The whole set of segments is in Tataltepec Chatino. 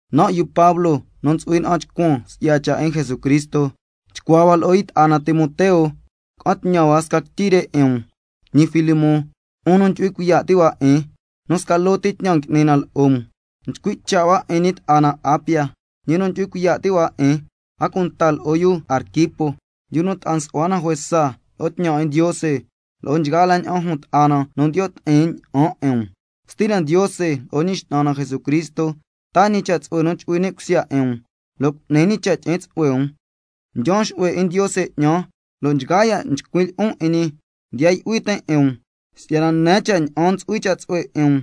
Nan' yu Pablo nu ntsu'hui na'an chcuan si'ya cha' 'in Jesucristo, chcuaa hua lo'o yu ta'a na Timoteo ca'an tñan hua sca quityi re 'in um, ñi Filemón, 'un nu ndyu'hui cuiya' ti' hua 'in, nu sca loo ti tñan ngui'ni na lo'o um. Nchcui' cha' hua 'in ñi ta'a na Apia, ñi nu ndyu'hui cuiya' ti' hua 'in, a cunta lo'o yu Arquipo, yu nu ta'a nsu'hua na juesa lo'o tñan 'in Ndiose, lo'o nchgaa la ña'an jun ta'a na nu ndiyo' ti'in ña'an 'in um. Stina Ndiose lo'o Ñi X'nan na Jesucristo taa ñi cha' tsu'hue nu chu'hui ni' cusya 'in um, lo' cu'ni ñi cha' tyi'in tsu'hue um. Ndyaan xu'hue 'in Ndiose 'ñan, lo' nchgaa ya' nchcuin' lyi'on 'in ñi ndiya yu'hui tin' 'in um, si'yana nen cha' ña'an ntsu'hui cha' tsu'hue 'in um,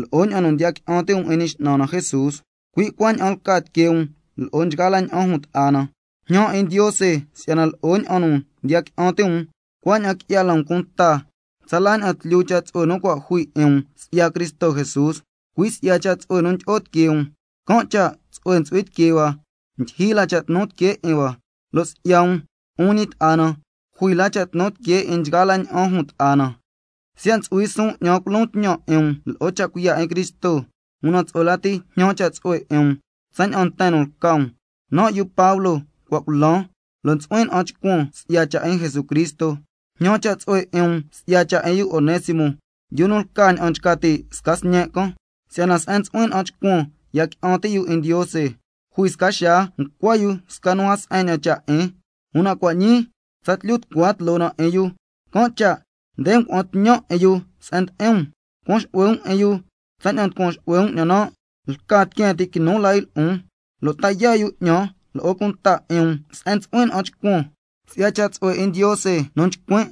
lo'o ña'an nu ndiya qui'an ti' um 'in Ñi X'nan na Jesús, cui' cuaña'an lca tiquee um lo'o nchgaa la ña'an jun ta'a na. Njñan 'in Ndiose si'yana lo'o ña'an nu ndiya qui'an ti' um, cuaña'an qui'ya la um cunta tsala ña'an tlyu cha' tsu'hue nu cua' jui 'in um si'ya Cristo Jesús. Cui' si'ya cha' tsu'hue nu ndyi'o tiquee um, can' cha' tsu'hue ntsu'hui tiquee hua, ndyijyi la cha' tnu tiquee 'in hua, lo' si'ya um, 'un ñi ta'a na, jui la cha' tnu tiquee 'in nchgaa la ña'an jun ta'a na. Siya' ntsu'hui suun 'ñan culon tñan 'in um lo'o cha' cuiya' 'in Cristo, una tsu'hue lati jñan cha' tsu'hue 'in um tsaña'an nten nu lca um, nan' yu Pablo cua' culan, lo' ntsu'huin na'an chcuan si'ya cha' 'in Jesucristo. Jñan cha' tsu'hue 'in um si'ya cha' 'in yu Onésimo, yu nu lca ña'an nchca ti' sca sñen' can, si'yana se'en ntsu'huin na'an chcuan ya qui'an ti' yu 'in Ndiose. Jui sca xaa ncua yu sca nu a se'en ña'an cha' 'in, una cua' ñii tsatlyu tucua tloo na 'in yu. Can' cha' nde ngua'an tñan 'in yu se'en ndi'in um, cuan xu'hue um 'in yu tsaña'an nducuan xu'hue um 'ñan nan'. Lca tiqueen ti' quinu la yu lo'on, lo' ta yaa' yu 'ñan lo'o cunta 'in um se'en ntsu'huin na'an chcuan si'ya cha' tsu'hue 'in Ndiose nu nchcuin'.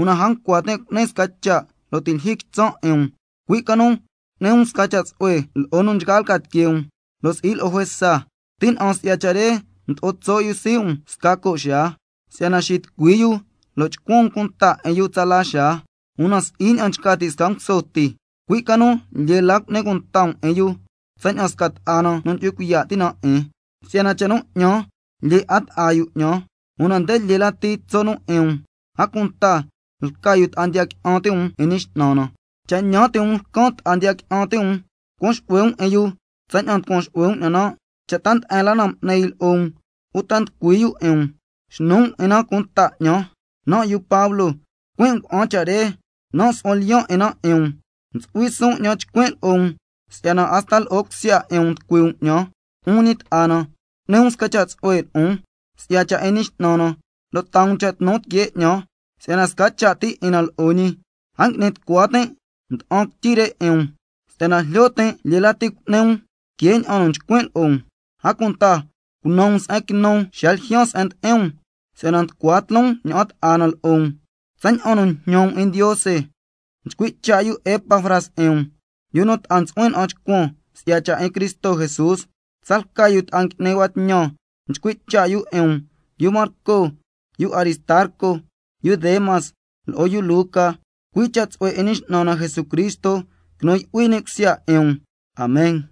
Una a ncua tin' cu'nin sca cha' xa nu ti' lyijyi quitsan' 'in um, cui' ca nu nchca tin' cu'ni um sca cha' tsu'hue loo nchgaa lca tiquee um, lo' si'i lo'o juesa. Tina'an si'ya cha' re mdo'o tso' yu sii' um sca co' xaa, si'yana xitucui yu lo' chcuan um cunta 'in yu tsala xaa, una si'i ña'an nchca ti' sca nguso ti, cui' ca nu lyee la cu'ni cunta um 'in yu tsaña'an sca ta'a na nu ndyu'hui cuiya' ti' na 'in, si'yana cha' nu 'ñan lyee 'a ta'a yu 'ñan, una nde lyee la tso' nu 'in um, a cunta lca yu ta'a ndiya qui'an ti' um 'in Ñi X'nan na. Cha' ñan ti' um lcan ta'a ndiya qui'an ti' um, cuan xu'hue um 'in yu tsaña'an nducuan xu'hue um 'ñan nan'. Cha' ta nde'en la na m'ni yu lo'o um uta nducui yu 'in um, xnu um 'in na cunta 'ñan. Nan' yu Pablo, cuin' ngua'an cha' re, nan' su'huan lyiyan' 'in na 'in um. Ntsu'hui suun 'ñan chcuin' lo'o um si'yana hasta lo'o cusya 'in um nducui um 'ñan. Cha' ñi, 'un ñi ta'a na, nchca tin' si'yana cu'ni um sca cha' tsu'hue lo'on si'ya cha' 'in Ñi X'nan na, lo' taa um cha' tnu tiquee 'ñan si'yana sca cha' ti 'in na lo'o ñi. A ngui'ni tucua tin' ngua'an quityi re 'in um si'yana jlyo tin' lyee lati cu'ni um que ña'an nu nchcuin' lo'o um. A cunta cunan um se'en quinun xa ljyaan se'en ndi'in um, si'yana nducua tloon ña'an ta'a na lo'o um tsaña'an nu njñan um 'in Ndiose. Nchcui' cha' yu Epafras 'in um, yu nu ta'a ntsu'huin na'an chcuan si'ya cha' 'in Cristo Jesús. Tsalca yu ta'a ngui'ni hua tñan nchcui' cha' yu 'in um: Yu Marco, yu Aristarco, yu Demas, lo'o yu Luca. Cui' cha' tsu'hue 'in Ñi X'nan na Jesucristo quinu yu'hui ni' cusya 'in um. Amen.